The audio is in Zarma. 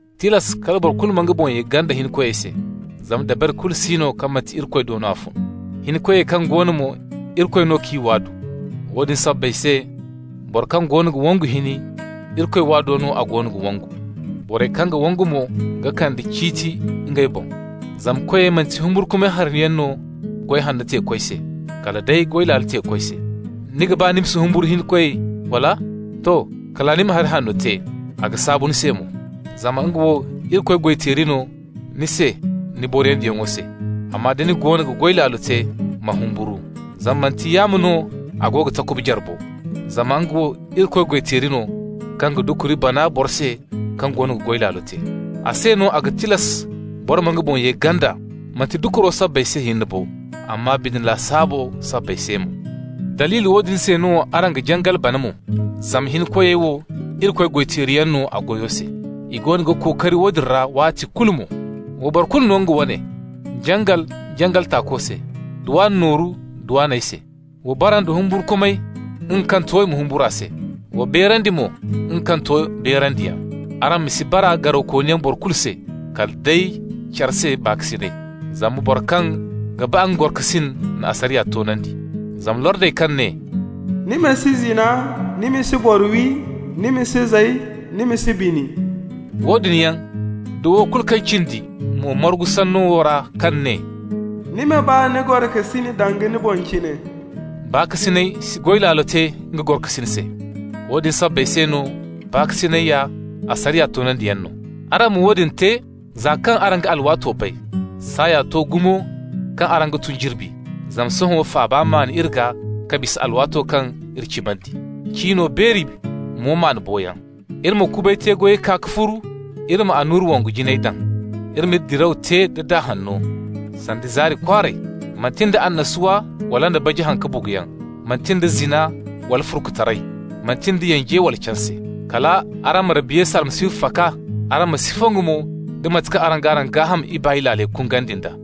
Tilas kala boro kulu ma nga boŋ ye ganda hinkoyey se, zama dabari kulu si no kaŋ manti Irikoy do no a fun. Hinkoyey kaŋ go no mo, Irikoy no k'i waadu. Woodin sabbay se, boro kaŋ goono ga wangu hini, Irikoy waado no a goono ga wangu. Borey kaŋ ga wangu mo ga kande ciiti ngey boŋ. Zama koyey manti humburkumay hariyaŋ no goy hanno teeko se, kala day goy laalo teeko se. Ni ga ba ma si humburu hinkoy, wala? To, kala ni ma hari hanno te, a ga saabu ni se mo. Zama nga wo Irikoy goy-teeri no ni se ni boriyandiyaŋo se. Amma da ni goono ga goy laalo te, ma humburu. Zama manti yaamo no a go ga takuba jare bo. Zama nga wo Irikoy goy-teeri no kaŋ ga dukuri bana boro se kaŋ goono ga goy laalo te. A se no a ga tilas boro ma nga boŋ ye ganda, manti dukuro sabbay se hinne bo, amma bine lasaabo sabbay se mo. Daliili woodin se no araŋ ga jangal bana mo, zama hinkoyey wo Irikoy goy-teeriyaŋ no a goyo se. I goono ga kookari woodin ra waati kulu mo. Wa boro kulu no nga wane: jangal, jangal tako se, dwan nooru, dwanyey se. Wa bara nda humburkumay, nga kaŋ to i ma humbur'a se. Wa beerandi mo nga kaŋ to beerandiyaŋ. Araŋ ma si bara garawkooniyaŋ boro kulu se, kala day care se baakasinay, zama boro kaŋ ga ba nga gorokasin na asariya toonandi. Zama lordey kaŋ ne: «Ni ma si zina, ni ma si boro wi, ni ma si zay, ni ma si bini --» woodin yaŋ da wo kulu kaŋ cindi mo margu sanno wo ra kaŋ ne: «Ni ma ba ni gorokasin danga ni boŋ cine.» Baakasinay si goy laalo te nga gorokasin se. Woodin sabbay se no baakasinay ya asariya toonandiyaŋ no. Araŋ ma woodin te, za kaŋ araŋ ga alwaato bay. Saaya to gumo kaŋ araŋ ga tun jirbi, zama sohõ faaba maan iri gaa ka bisa alwaato kaŋ iri cimandi. Cino beeri, mo maan boyaŋ. Iri ma kubay te-goyey kaa ka furu, iri ma annura wongu jinayey daŋ. Iri m'iri diraw te da daa hanno, sanda zaari kwaaray, manti nda annasuwa wala nda baji haŋ-ka-buguyaŋ, manti nda zina wala furkutaray, manti nda yanje wala canse. Kal araŋ ma Rabbi Yesu Almasihu faka, araŋ ma si fongu mo nda mate kaŋ araŋ g'araŋ gaaham ibaay laaley kungandi nd'a.